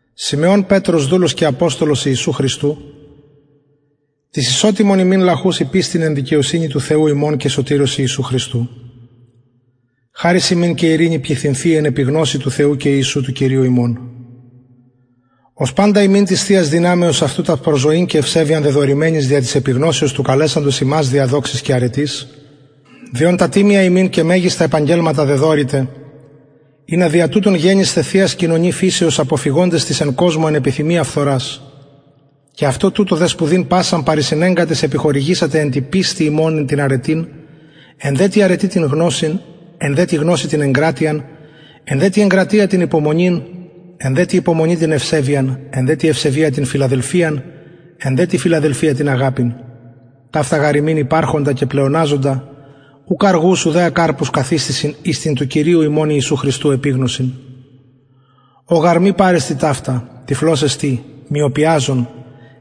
συμεων πετρος δουλος και αποστολος ιησου χριστου τοις ισοτιμον ημιν λαχουσιν πιστιν εν δικαιοσυνη του θεου ημων και σωτηρος ιησου χριστου χαρις υμιν και ειρηνη πληθυνθειη εν επιγνωσει του θεου και ιησου του κυριου ημων ως παντα ημιν της θειας δυναμεως αυτου τα προς ζωην και ευσεβειαν δεδωρημενης δια της επιγνωσεως του καλεσαντος ημας δια δοξης και αρετης δι ων τα τιμια ημιν και μεγιστα επαγγελματα δεδωρηται ινα δια τουτων γενησθε θειας κοινωνοι φυσεως αποφυγοντες της εν κοσμω εν επιθυμια φθορας και αυτο τουτο δε σπουδην πασαν παρεισενεγκαντες επιχορηγησατε εν τη πιστει υμων την αρετην εν δε τη αρετη την γνωσιν εν δε τη γνωσει την εγκρατειαν εν δε τη εγκρατεια την υπομονην εν δε τη υπομονη την ευσεβειαν εν δε τη ευσεβεια την φιλαδελφιαν εν δε τη φιλαδελφια την αγαπην ταυτα γαρ υμιν υπαρχοντα και πλεοναζοντα ουκ αργους ουδε ακαρπους καθιστησιν εις την του κυριου ημων ιησου χριστου επιγνωσιν ω γαρ μη παρεστιν ταυτα τυφλος εστιν μυωπαζων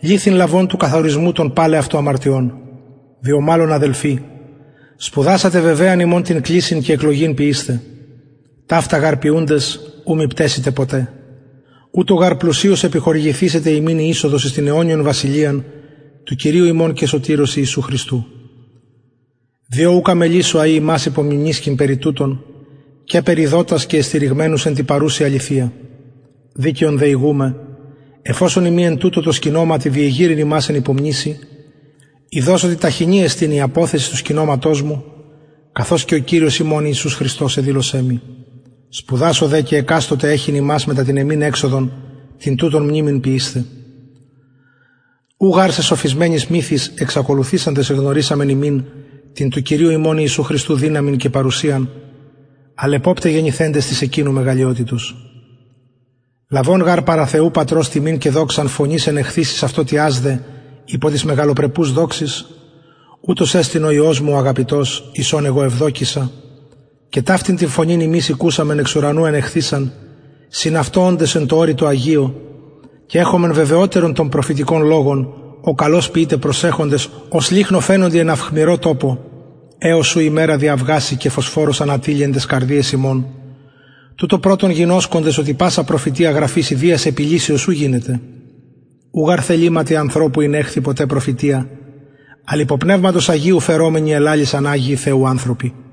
ληθην λαβων του καθαρισμου των παλαι αυτου αμαρτιων διο μαλλον αδελφοι σπουδασατε βεβαιαν υμων την κλησιν και εκλογην ποιεισθαι ταυτα γαρ ποιουντες ου μη πταισητε ποτε ουτως γαρ πλουσιως επιχορηγηθησεται υμιν η εισοδος εις την αιωνιον βασιλειαν του κυριου ημων και σωτηρος ιησου χριστου διο ουκ αμελησω αει υμας υπομιμνησκειν περι τουτων καιπερ ειδοτας και εστηριγμενους εν τη παρουση αληθεια δικαιον δε ηγουμαι εφ οσον ειμι εν τουτω τω σκηνωματι διεγειρειν υμας εν υπομνησει ειδως οτι ταχινη εστιν η αποθεσις του σκηνωματος μου καθως και ο κυριος ημων ιησους χριστος εδηλωσεν μοι σπουδασω δε και εκαστοτε εχειν υμας μετα την εμην εξοδον την τουτων μνημην ποιεισθαι ου γαρ σεσοφισμενοις μυθοις εξακολουθησαντες εγνωρισαμεν υμιν την του κυριου ημων ιησου χριστου δυναμιν και παρουσιαν αλλ εποπται γενηθεντες της εκεινου μεγαλειοτητος λαβων γαρ παρα θεου πατρος τιμην και δοξαν φωνης ενεχθεισης αυτω τοιασδε υπο της μεγαλοπρεπους δοξης ουτος εστιν ο υιος μου ο αγαπητος εις ον εγω ευδοκησα και ταυτην την φωνην ημεις ηκουσαμεν εξ ουρανου ενεχθεισαν συν αυτω οντες εν τω ορει τω αγιω και εχομεν βεβαιοτερον τον προφητικον λογον ω καλως ποιειτε προσεχοντες ως λυχνω φαινοντι εν αυχμηρω τοπω εως ου ημερα διαυγαση και φωσφορος ανατειλη εν ταις καρδιαις υμων τουτο πρωτον γινωσκοντες οτι πασα προφητεια γραφης ιδιας επιλυσεως ου γινεται ου γαρ θεληματι ανθρωπου ηνεχθη ποτε προφητεια αλλ υπο πνευματος αγιου φερομενοι ελαλησαν αγιοι θεου ανθρωποι